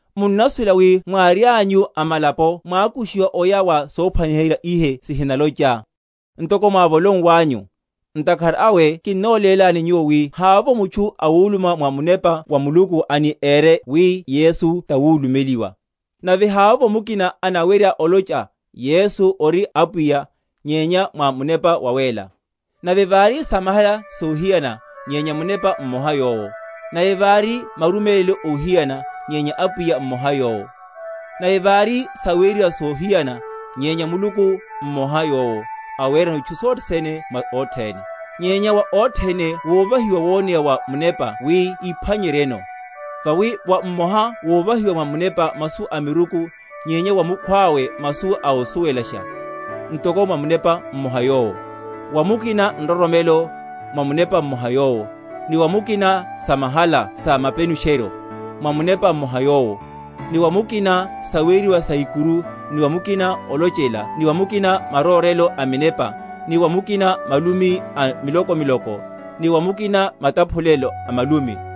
Munnasuwela wi mwárianyu amalapo mwákushiwa oya wa sophwaniherya ihe sihinalocha, ntoko mwáhóliwanyu. Ntakhara awe kinnolélani nyuwo, wi havovo mutchu awuluma mwa Munepa wa Muluku ani ére wi Yesu tawulumeliwa; nave havovo mukina anawerya olocha, Yesu ori Apwiya, nyenya mwa Munepa Wawéla. Nave vari samahala sohiyana, nyenya Munepa mmoha yowo. Nave vari marumélelo óhiyana, nyenya Apwiya mmoha yowo. Nave vari saweriwa sohiyana, nyenya Muluku mmoha yowo, awerano itchu sothe sene mwa othene. Nyenya wa othene wovahiwa woneya wa Munepa wi iphwanyeryeno. Vawi wa mmoha wovahiwa mwa Munepa masu a miruku; nyenya wa mukhwawe masu ósuwelasha, ntoko mwa Munepa mmoha yowo; wa mukina nroromelo, mwa Munepa mmoha yowo; ni wa mukina samahala sa mapenusheryo, mwa Munepa mmoha yowo; ni wa mukina saweriwa sa ikuru; ni wa mukina olochela ni wa mukina marórelo a minepa; ni wa mukina malumi a miloko‐miloko; ni wa mukina mataphulelo a malumi.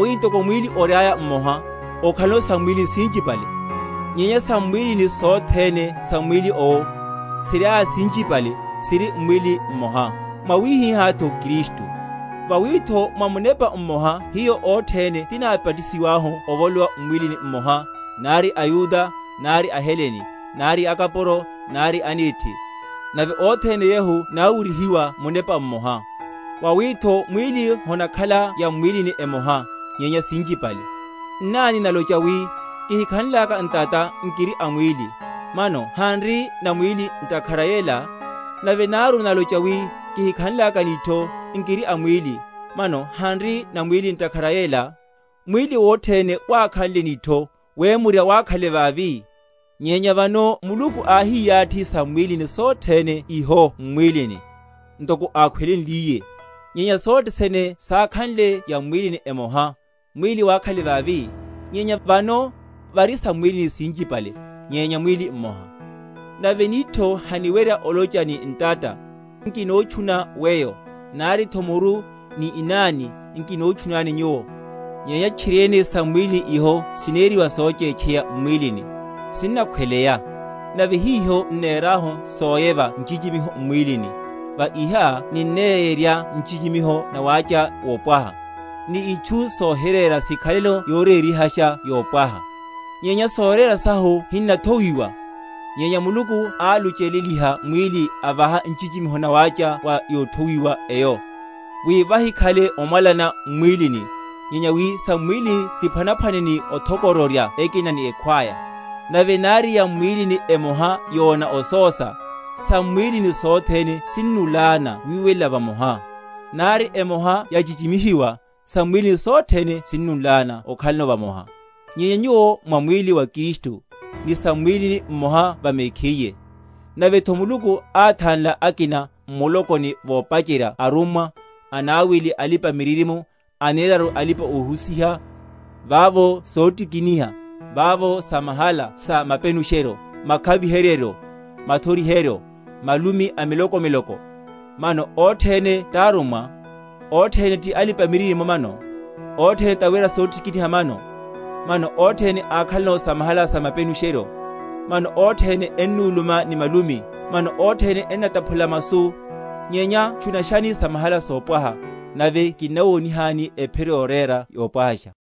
Vawi ntoko mwíli oriaya mmoha, okhalano sam’mwílini sinchipale; nyenya sam’mwílini sothene sa mwíli owo, siriaya sinchipale, siri mwíli mmoha; mwawihihátho Kristu. Vawitho mwa Munepa mmoha hiyo othene tinábatisiwahu ovolowa m’mwílini mmoha, nari aYuda, nari aHelene, nari akapuro, nari anethi; nave othene yehu náwuryihiwa Munepa mmoha. Vawitho mwíli honakhala yam’mwílini emoha, nyenya sinchipale. Nnani nalocha wi, Kihikhanlaka ntata, nkiri a mwíli; mano hanri na mwíli ntakhara yela? Nave náru nalocha wi, Kihikhanlaka nitho, nkiri a mwíli; mano hanri na mwíli ntakhara a yela? Mwíli wothene wákhanle nitho, wemurya wákhale vavi? Nyenya vano Muluku áhiyathi sam’mwílini sothene iho m’mwílini, ntoko ákhweleliye. Nyenya sothe sene sákhanle yam’mwílini emoha, mwíli wákhale vavi? Nyenya vano vari sam’mwílini sinchipale, nyenya mwíli mmoha. Nave nitho haniwerya olocha ni ntata, Nkinotchuna weyo; naritho muru ni inani, Nkinotchunani nyuwo. Nyenya tchiriene sam’mwílini iho sineriwa sochétcheya m’mwílini, sinnakhweleya; nave hiho n’nerahu soyeva nchichimiho m’mwílini, va iha ninneyerya nchichimiho nawácha wopwaha; ni itchu sohirera sikhaleno yorerihasha yopwaha. Nyenya sorera sahu hinathowiwa; nyenya Muluku álucheleliha mwíli, avaha nchichimiho nawácha wa yothowiwa eyo; wi vahikhale omwalana m’mwílini; nyenya wi sam’mwílini siphwanaphwane ni othoko?-?roryana ekina ni ekhwaya. Nave nari yam’mwílini emoha yona osósa, sam’mwílini sothene sinnúlána wiwela vamoha; nari emoha yachichimihiwa, sam’mwílini sothene sinnúlána okhalano vamoha. Nyenya nyuwo mwa mwíli wa Kristu, ni sam’mwílini, mmoha va mekhiye. Navetho Muluku áthanla akina m’mulokoni, vopacherya arummwa, anawili alipa‐miririmo, aneraru alipa‐ohusiha, vavo sotikiniha, vavo samahala sa mapenusheryo, makhaviheryeryo, mathoriheryo, malumi a miloko‐miloko. Mano othene tárummwa? Othene ti alipa‐miririmo mano? Othene tawera sotikiniha mano? Mano othene ákhalano samahala sa mapenusheryo? Mano othene ennuluma ni malumi? Mano othene ennataphulela masu? Nyenya tchunashani samahala sopwaha. Nave kinnawonihani ephiro yorera yopwahasha.